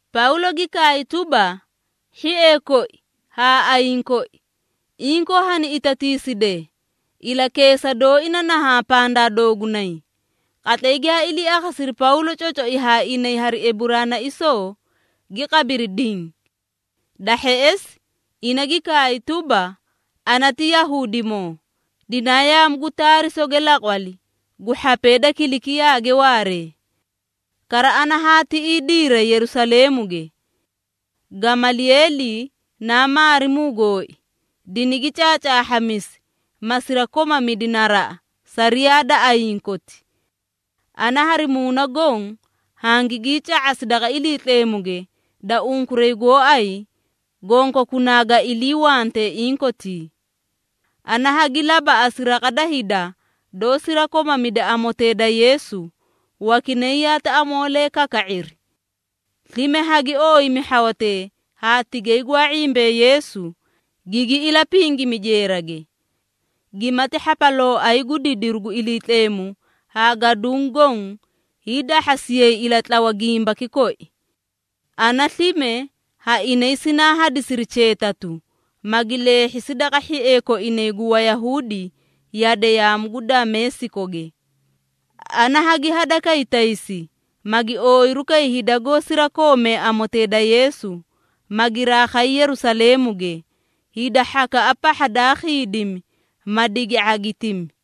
Pawlo gi kaay tuba, “Hhiee koi haa ayiĩ koi, inkoo hani itatiisidee, ilakeesa dooi na nahaã pandaa doogunay.” Qatlay giyaa ilii akhasiri Pawlo cocoi haa inay hari Eburaanaisoo, gi qabiri diĩ. Da hheꞌesi ina gi kaay tuba, “Ana ti Yahuudimoo, dinaa yaamu gu Taarisoge laqwali gu hhapee da Kilikiyaage waaree. Kara ana haa tiꞌii diiray Yerusaleemuge. Gamalieeli naa maarimuu gooi, dinigi caacaahhamisi, ma sirakomamidi naraꞌa sariyaa da ayiĩ koti. Ana hari muuna goõ hangigii ca⁄asi daqa Iliitleemuge da unkuray gooay gonkokunaa ga iliiwantee inkotii. Ana hagi labaꞌasi raqa da hida doó sirakomamida amotee da Yeesu, wakinay yaati amoolee kaka⁄iri. Slime hagi ooyimi hhawatee haa tigay gwaa ⁄imbee Yeesu, gigi ilapingimi jeerage. Gimati hhapalooay gu didiru gu Iliitleemu haa gaduũ goõ hiidahhasiyay ilatlawa gimbaki koi. Ana slime ha inay sinaa hadisiri cheetatu, magi leehhisi daqa hhiee koinay gu Wayahuudi yade yaamu gu Dameesikoge. Ana hagi hadakay taysi, magi ooyiru kay hida goó sirakoomee amotee da Yeesu, ma giraa khay Yerusaleemuge, hida hhakaꞌa pahha daa khiidimi, ma digi ⁄agitimi.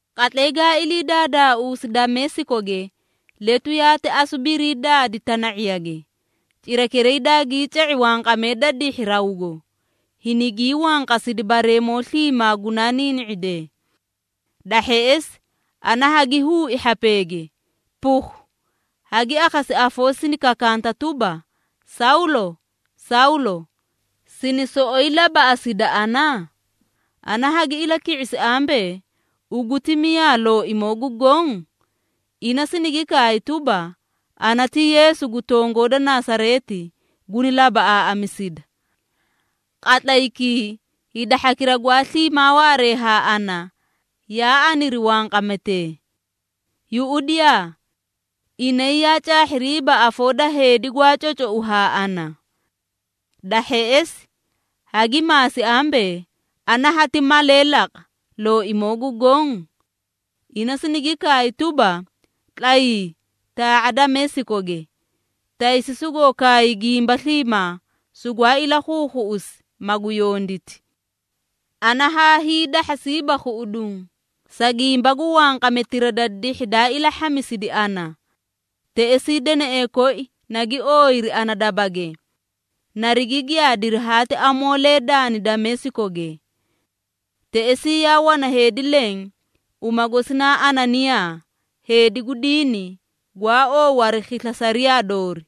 Qatlay gaa ilii daadaausi Dameesikoge, letu yaati asu barii daadi tana⁄iyage. Cirakiray daagii ca⁄i wanqamee da dihhi rawgo, hinigii wanqasidi bareemoo sliimaa gunaa niini⁄idee. Da hheꞌesi ana hagi huui hhapeege, ‘Pukhu!’ Hagi akhasi afoo sini kakanta tuba, ‘Sawlo! Sawlo! Sina soꞌoyi labaꞌasida ana?’ Ana hagi ilaki⁄isi ambee, ‘Ugu ti miyaa, Looimoo gu Goõ?’ Ina sinigi kaay tuba, ‘Ana ti Yeesu gu tongoo da Nasareeti, guni labaꞌaaꞌamisida.’ Qatlaykii hida hhakira gwaa sliimaa waaree haa ana, yaa aniri wanqametee. Yuꞌudiyaa! Inay yaa caahhiriiba afoo da heedi, gwaa cocou haa ana. Da hheꞌesi hagi maasi ambee, ‘Ana hati malee laqa, Looimoo gu Goõ?’ Ina sinigi kaay tuba, ‘Tlayii, taa⁄a Dameesikoge, taysi sugoo kaay gimba sliimaa, sugwaa ilakhuukhuꞌusi, magu yonditi.’ Ana haa hiidahhasiiba khuꞌuduũ, sa gimba gu wanqametira da dihhi daa ilahhamisidi ana. Teꞌesii deneꞌee koi nagi ooyiri ana dabage, narigi giyaadiri haati amoolee daani Dameesikoge. Teꞌesii yaa wana heedi leẽ, uma gosi naa Ananiyaa, heedi gu diini, gwaa oow hari khisla sariyaa doori.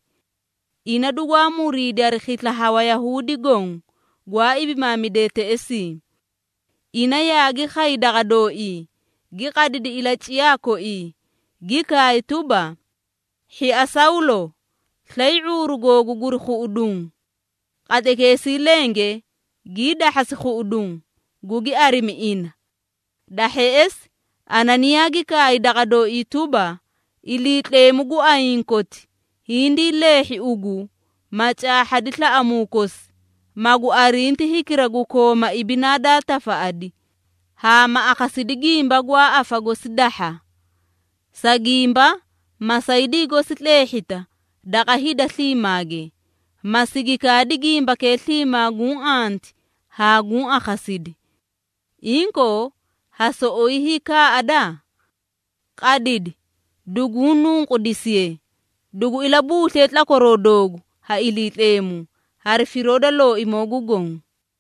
Ina dugwaa muriidi hari khisla ha Wayahuudi goõ, gwaa ibimaamidee teꞌesii. Ina yaagi khay daqa dooii, gi qadidi ilaciyaa koii, gi kaay tuba, ‘Hhia Sawlo, slay ⁄uuru googu guri khuꞌuduũ!’ Qatlaykeesii lenge gii dahhasi khuꞌuduũ, gugi arimi ina. Da hheꞌesi Ananiyaa gi kaay daqa dooii tuba, ‘Iliitleemu gu ayiĩ koti, hindii leehhi ugu, ma caahhadi slaꞌamuu kosi, magu arinti hikira gu Kooma Ibinaa daa Tafaꞌadi, haa ma akhasidi gimba gwaa afa gosi dahha. Sa gimba masaydii gosi tleehhita daqa hida sliimaage, ma sigi kaadi gimbakee sliimaa guũ anti haa guũ akhasidi. Inkoo, ha soꞌoyi hiikaaꞌada? Qadidi, duguu nunqudisiye, dugu ilabuusliye tlakwaroo doogu ha Iliitleemu, hari firoo da Looimoo gu Goõ.’”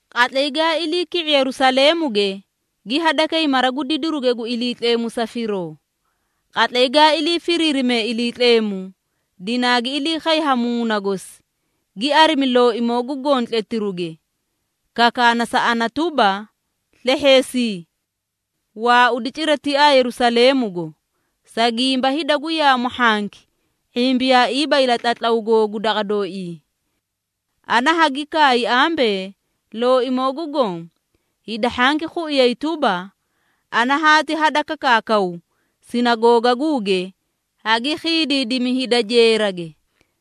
“Qatlay gaa ilii ki⁄i Yerusaleemuge, gi hadakay mara gu didiruge gu Iliitleemu sa firoo. Qatlay gaa ilii firiirime Iliitleemu, dinaagi ilii khay ha Muuna gosi, gi arimi Looimoo gu Goõ tletiruge, kakaana sa ana tuba, ‘Slehheesii! Waaudi cira tiaa Yerusaleemugo, sa gimba hida gu yaamu hhanki ⁄imbiyaaiiba ilatlatlaw googu daqa dooii.’ Ana hagi kaay ambee, ‘Looimoo gu Goõ, hida hhanki khuiyay tuba, ana haati hadakakaakaw sinagoogaguuge, hagi khiidiidimi hida jeerage,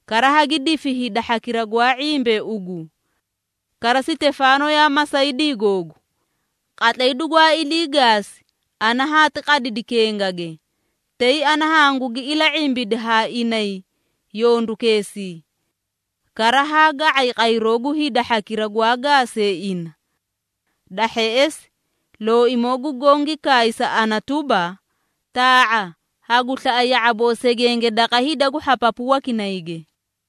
kara hagi difi hida hhakira gwaa ⁄imbee ugu. Kara Sitefaano yaa masaydii googu. Qatlay dugwaa ilii gaasi, ana haati qadidi kengage, tay ana hangugi ila⁄imbidi haa inay yondukeesii. Kara, haa ga⁄ay qayroo gu hida hhakira gwaa gaasee ina.’ Da hheꞌesi Looimoo gu Goõ gi kaay sa ana tuba, ‘Taa⁄a, hagu slaꞌa ya⁄aboo segenge daqa hida gu hhapapu wakinayge.’”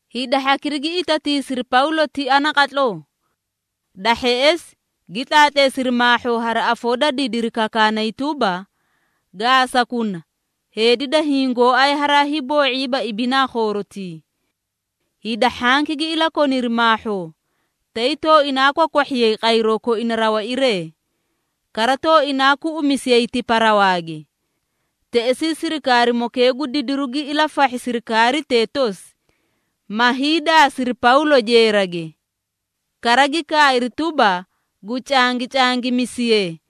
Hida hhakira gi itatiisiri Pawlo tia naqatloo. Da hheꞌesi gi tlaatleesiri maahhoo hari afoo da didiri kakaakanay tuba, “Gaasakuna! Heedi da hiĩ gooay haraa hiiboo⁄iiba ibinaa khoorotii.” Hida hhanki gi ilakoniri maahhoo, tay tooinaa kwakwahhiyay qayroo koina rawairee, kara tooinaa kuꞌumisiyay tipa rawaage. Teꞌesii sirikaarimokee gu didiru gi ilafahhi sirikaaritee tosi, ma hiidaasiri Pawlo jeerage. Kara gi kaay tuba, gu cangicangimisiye,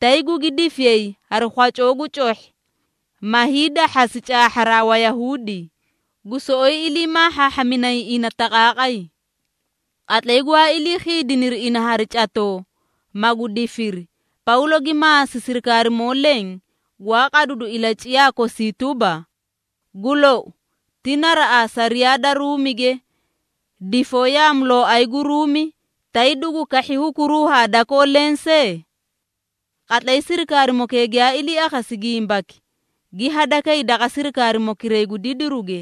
tay gugi difiyay hari khwacoo gu cohhi, ma hiidahhasi caahharaa Wayahuudi, gu soꞌoyi ilii maahhaahhaminay ina taqaaqay. Qatlay gwaa ilii khiidiniri ina hari catoo, magu difiri, Pawlo gi maasi sirikaarimoo leẽ gwaa qadidu ilaciyaa kosii tuba, “Gu lou, ti naraꞌaa sariyaa da Ruumige, difoo yaamulooay gu Ruumi, tay dugu kahhi hukuruu ha dakoo lensee?” Qatlay sirikaarimokee giyaa ilii akhasi gimbaki, gi hadakay daqa sirikaarimokiray gu didiruge,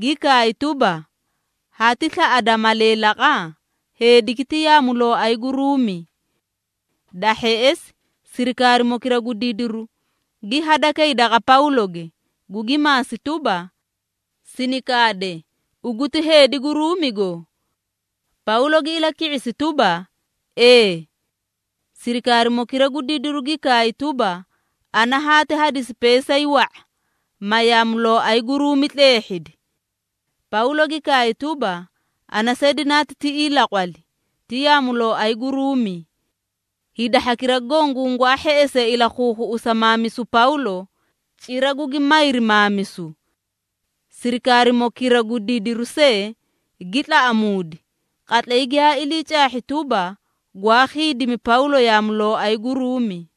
gi kaay tuba, “Hati slaꞌada malee laqa? Heediki ti yaamulooay gu Ruumi.” Da hheꞌesi, sirikaarimokira gu didiru gi hadakay daqa Pawloge, gugi maasi tuba, “Sini kaade, ugu ti heedi gu Ruumigo?” Pawlo gi ilaki⁄isi tuba, “Ee.” Sirikaarimokira gu didiru gi kaay tuba, “Ana haati hadisi peesay wa⁄a, ma yaamulooay gu Ruumi tleehhidi.” Pawlo gi kaay tuba, “Ana see dinaa tiꞌii laqwali, ti yaamulooay gu Ruumi.” Hida hhakira goõ gungwaa hheꞌesee ilakhuukhuꞌusa maamisu Pawlo, cira gugi mayri maamisu. Sirikaarimokira gu didiru see gi tlaꞌamuudi, qatlay giyaa ilii caahhi tuba, gwaa khiidimi Pawlo yaamulooay gu Ruumi.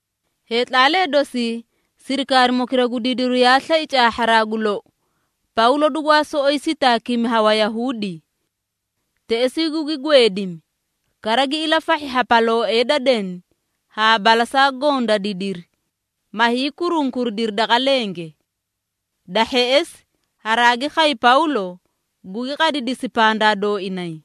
Heetlaalee dosi, sirikaarimokira gu didiru yaa slai caahharaa gu lou, Pawlo dugwaa soꞌoyi sitaakimi ha Wayahuudi. Teꞌesii gugi gweedimi, kara gi ilafahhi hhapalooee da deni haa balasaa goõ da didiri, ma hiikurunkuridiri daqa lenge. Da hheꞌesi, haraagi khay Pawlo, gugi qadidisi pandaa dooinay.